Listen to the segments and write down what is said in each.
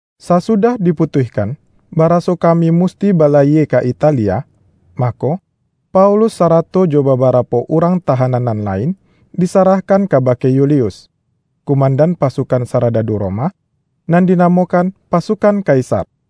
Sasudah diputuihkan, baraso kami musti balayie ka Italia, mako, Paulus sarato jo babarapo urang tahanan nan lain, disarahkan kabake Yulius, kumandan pasukan saradadu Roma, nan dinamokan”Pasukan Kaisar”.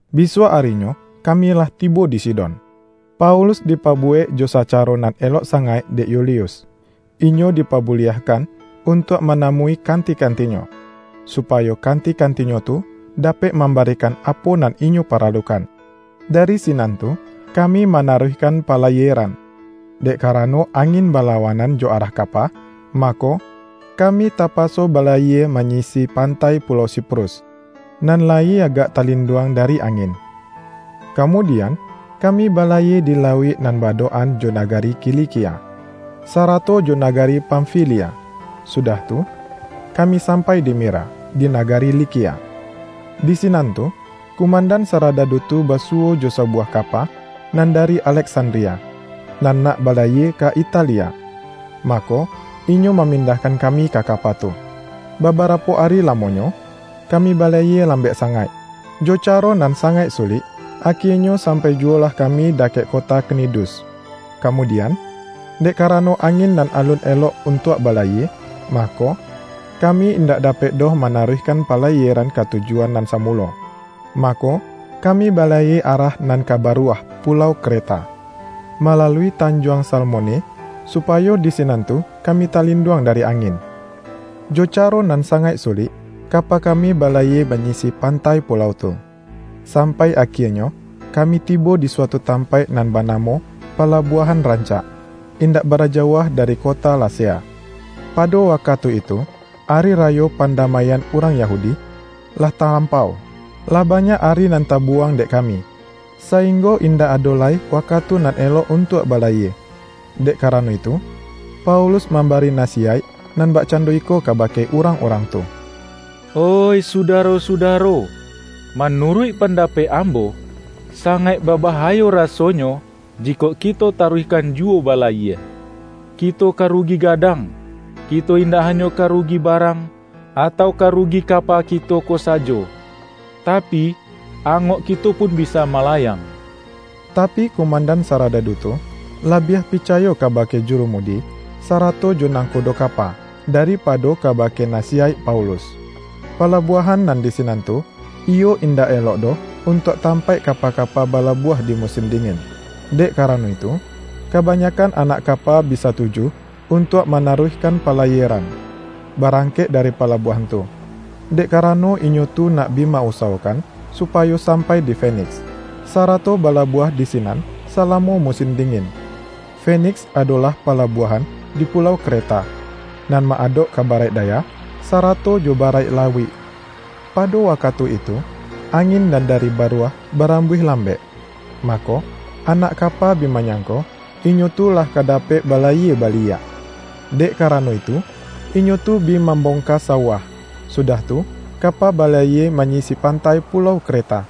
Bisuak arinyo kami lah tibo di Sidon. Paulus dipabuwek jo sacaro nan elok sangaik dek Yulius. Inyo dipabuliahkan untuak manamui kanti-kantinyo, supayo kanti-kantinyo tu dapek mambarikan apo nan inyo paralukan. Dari sinan tu, kami manaruihkan palayieran. Dek karano angin balawanan jo arah kapa, mako, kami tapaso balayie manyisi pantai pulau Siprus, nan layi agak talinduang dari angin. Kamudian, kami balayie di lauik nan ba-adok-an jo nagari Kilikia, sarato jo nagari Pamfilia, sudah tu, kami sampai di Mira, di nagari Likia. Di sinan tu, kumandan saradadu tu basuwo jo sabuwah kapa nan dari Aleksandria, nan nak balayie ka Italia. Mako, inyo mamindahkan kami ka kapa tu. Babarapo ari lamonyo, kami balayie lambek sangaik, jo caro nan sangaik sulik, akienyo sampai juwolah kami dakek kota Knidus. Kamudian, dek karano angin nan alun elok untuak balayie, mako, kami indak dapek doh manaruihkan palayieran ka tujuan nan samulo. Mako, kami balayie arah nan ka Baruah pulau Kreta, malalui Tanjuang Salmone, supayo di sinan tu kami talinduang dari angin. Jo caro nan sangaik sulik, kapa kami balayie manyisi pantai pulau tu, sampai akienyo kami tibo di suatu tampaik nan banamo Palabuahan Rancak, indak bara jauah dari kota Lasea. Pado wakatu itu, Ari Rayo Pandamaian urang Yahudi, lah talampau. Lah banyak ari nan tabuwang dek kami, sainggo indak ado lai wakatu nan elok untuak balayie. Dek karano itu, Paulus mambari nasiyaik nan bakcando iko kabake urang-urang tu, ”Oih sudaro-sudaro, manuruik pandapek ambo, sangaik babahayo rasonyo jikok kito taruihkan juwo balayie. Kito ka rugi gadang, kito indak hanyo ka rugi barang, atau ka rugi kapa kito ko sajo, tapi, angok kito pun bisa malayang.” Tapi, kumandan saradadu tu, labiah picayo kabake jurumudi, sarato jo nangkodo kapa, daripado kabake nasiyaik Paulus. Palabuahan nan di sinan tu, iyo indak elok doh untuak tampaik kapa-kapa balabuah di musin dingin. Dek karano itu, kabanyakkan anak kapa bi satuju untuak manaruihkan palayieran, barangkek dari palabuahan tu, dek karano inyo tu nak bi ma-usawokan supayo sampai di Feniks, sarato balabuah di sinan salamo musin dingin. Feniks adolah palabuahan di pulau Kreta, nan ma-adok ka Baraik Daya, sarato jo Baraik Lauik. Pado wakatu itu, angin nan dari Baruah barambuih lambek. Mako, anak kapa bi manyangko, inyo tu lah ka dapek balayie baliak. Dek karano itu, inyo tu bi mambongka sauah, sudah tu kapa balayie manyisi pantai pulau Kreta.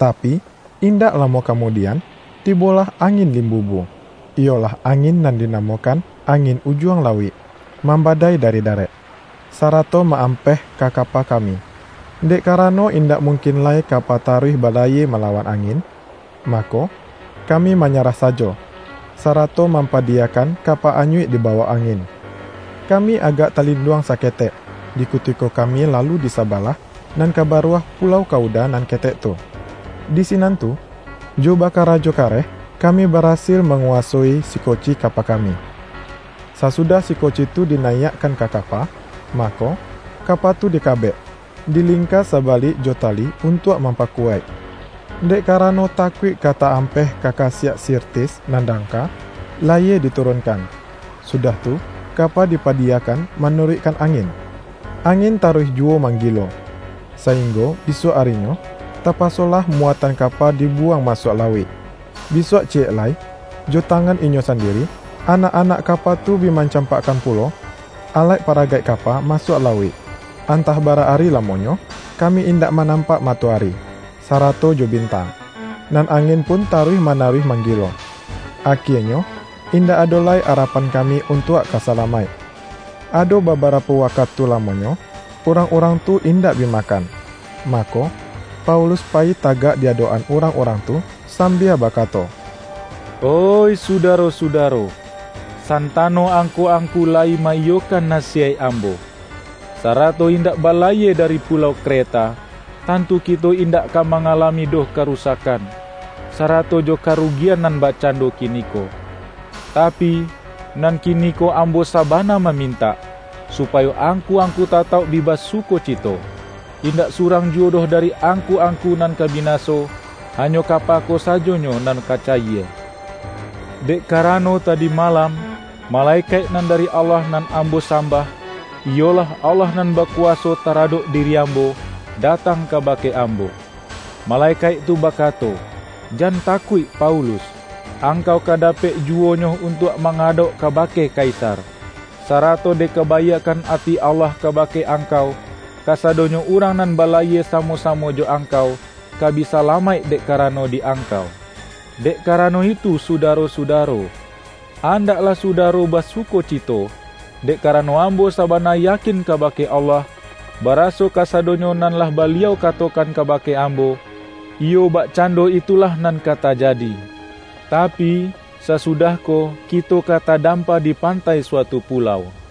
Tapi, indak lamo kamudian, tibolah angin limbubu — iyolah angin nan dinamokan angin Ujuang Lauik — mambadai dari darek, sarato ma-ampeh ka kapa kami. Dek karano indak mungkin lai kapa taruih balayie malawan angin, mako, kami manyarah sajo, sarato mampadiyakan kapa anyuik dibawok angin. Kami agak talinduang saketek, di kutiko kami lalu di sabalah nan ka Baruah pulau Kauda nan ketek tu. Di sinan tu, jo bakarajo kareh kami barasil manguwasoi sikoci kapa kami. Sasudah sikoci tu dinayiakkan ka kapa, mako, kapa tu dikabek, dilingka sabalik jo tali untuak mampakuwaik. Dek karano takuik ka ta-ampeh ka kasiak Sirtis nan dangka, layie diturunkan, sudah tu kapa dipadiyakan manuruikkan angin. Angin taruih juwo manggilo, sainggo bisuak arinyo, tapasolah muatan kapa dibuwang masuak lauik. Bisuak ciyek lai, jo tangan inyo sandiri, anak-anak kapa tu bi mancampakkan pulo alaik-paragaik kapa masuak lauik. Antah bara ari lamonyo, kami indak manampak matoari, sarato jo bintang, nan angin pun taruih manaruih manggilo. Akienyo, indak ado lai arapan kami untuak ka salamaik. Ado babarapo wakatu lamonyo, urang-urang tu indak bi makan. Mako, Paulus payi tagak di adokan urang-urang tu sambia bakato,”Oih sudaro-sudaro! Santano angku-angku layi ma-iyokan nasiyaik ambo, sarato indak balayie dari pulau Kreta, tantu kito indak ka mangalami doh karusakkan, sarato jo karugian nan bakcando kiniko. Tapi, nan kiniko ambo sabana mamintak, supayo angku-angku tatauk bi basukocito. Indak surang juwo doh dari angku-angku nan ka binaso; hanyo kapa ko sajonyo nan ka cayie. Dek karano tadi malam, malekaik nan dari Allah nan ambo sambah, iyolah Allah nan bakuwaso taradok diri ambo, datang kabake ambo. Malekaik tu bakato, ’Jan takuik Paulus! Angkau ka dapek juwonyo untuak mangadauk kabake Kaisar. Sarato dek kabaiakkan ati Allah kabake angkau, kasadonyo urang nan balayie samo-samo jo angkau, ka bi salamaik dek karano di angkau.’ Dek karano itu Sudaro-sudaro, andaklah Sudaro basukocito! Dek karano ambo sabana yakin kabake Allah, baraso kasadonyo nan lah Baliau katokan kabake ambo, iyo bakcando itulah nan ka tajadi. Tapi, sasudah ko kito ka tadampa di pantai suatu pulau.”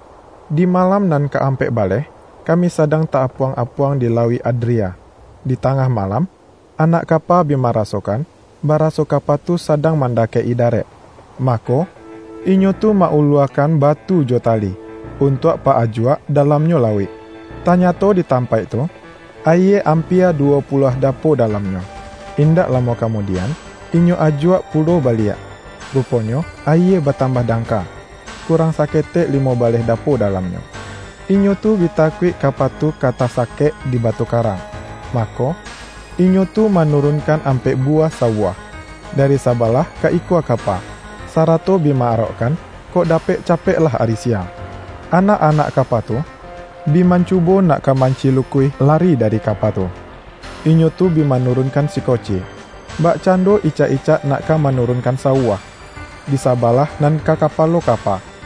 Di malam nan ka ampek baleh, kami sadang ta-apuang-apuang di Lauik Adria. Di tangah malam, anak kapa bi marasokan, baraso kapa tu sadang mandakek-i darek. Mako, inyo tu ma-uluakan batu jo tali, untuak pa-ajuak dalamnyo lauik. Tanyato di tampaik tu, ayie ampia duwo puluah dapo dalamnyo. Indak lamo kamudian, inyo ajuak pulo baliak, ruponyo ayie batambah dangka, kurang saketek limo baleh dapo dalamnyo. Inyo tu bi takuik kapa tu ka tasakek di batu karang, mako, inyo tu manurunkan ampek buwah sauah, dari sabalah ka ikua kapa, sarato bi ma-arokkan, kok dapek capeklah ari siang. Anak-anak kapa tu, bi mancubo nak ka mancilukuih lari dari kapa tu. Inyo tu bi manurunkan sikoci, bakcando icak-icak nak ka manurunkan sauah, di sabalah nan ka kapalo kapa.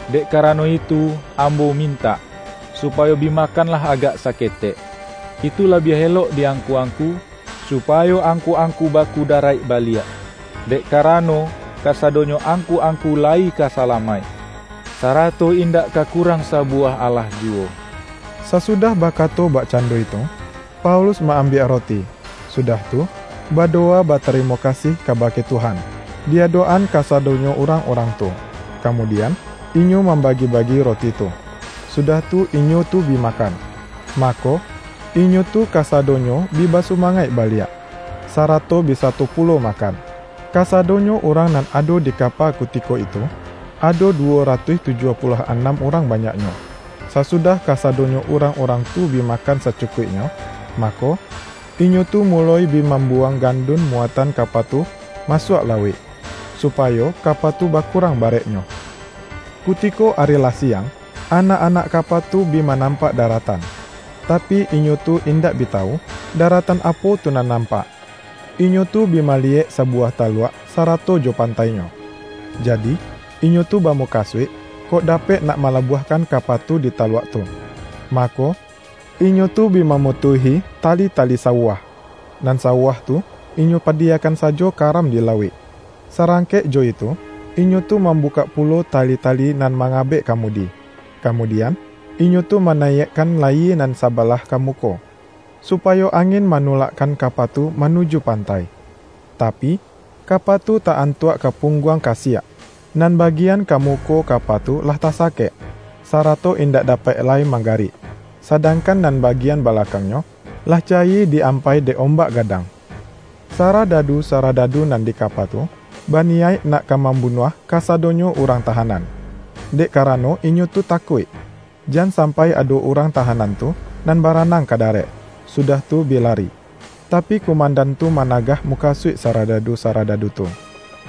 Dek karano itu ambo mintak, supayo bi makanlah agak saketek. Itu labiah elok di angku-angku, supayo angku-angku bakudaraik baliak. Dek karano kasadonyo angku-angku layi ka salamaik, sarato indak ka kurang sabuwah alahjuwo.” Sasudah bakato bakcando itu, Paulus ma-ambiak roti, sudah tu, badowa batarimo kasih kabake Tuhan, di adok-an kasadonyo urang-urang tu. Kamudian, inyo mambagi-bagi roti tu, sudah tu inyo tu bi makan. Mako, inyo tu kasadonyo bi basumangaik baliak, sarato bi sato pulo makan. Kasadonyo urang nan ado di kapa kutiko itu, ado duwo ratuih tujuah puluah anam urang banyaknyo. Sasudah kasadonyo urang-urang tu bi makan sacukuiknyo, mako, inyo tu muloi bi mambuwang gandun muatan kapa tu masuak lauik, supayo kapa tu bakurang bareknyo. Kutiko ari lah siang, anak-anak kapa tu bi manampak daratan, tapi, inyo tu indak bi tawu, daratan apo tu nan nampak. Inyo tu bi maliyek sabuwah taluak sarato jo pantainyo. Jadi, inyo tu bamukasuik, kok dapek nak malabuahkan kapa tu di taluak tu. Mako, inyo tu bi mamutuihi tali-tali sauah, nan sauah tu inyo padiyakan sajo karam di lauik. Sarangkek jo itu, inyo tu mambukak pulo tali-tali nan mangabek kamudi. Kamudian, inyo tu manayiakkan layie nan sabalah ka muko, supayo angin manulakkan kapa tu manuju pantai. Tapi, kapa tu ta-antuak ka pungguang kasiak. Nan bagian ka muko kapa tu lah tasakek, sarato indak dapek lai manggarik, sadangkan nan bagian balakangnyo, lah cayie di-ampai dek ombak gadang. Saradadu-saradadu nan di kapa tu, baniyaik nak ka mambunuah kasadonyo urang tahanan, dek karano inyo tu takuik, jan sampai ado urang tahanan tu nan baranang ka darek, sudah tu bi lari. Tapi, kumandan tu managah mukasuik saradadu-saradadu tu,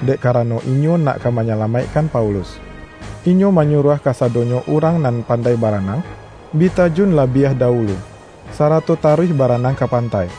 dek karano inyo nak ka manyalamaikkan Paulus. Inyo manyuruah kasadonyo urang nan pandai baranang, bi tajun labiah dawulu, sarato taruih baranang ka pantai;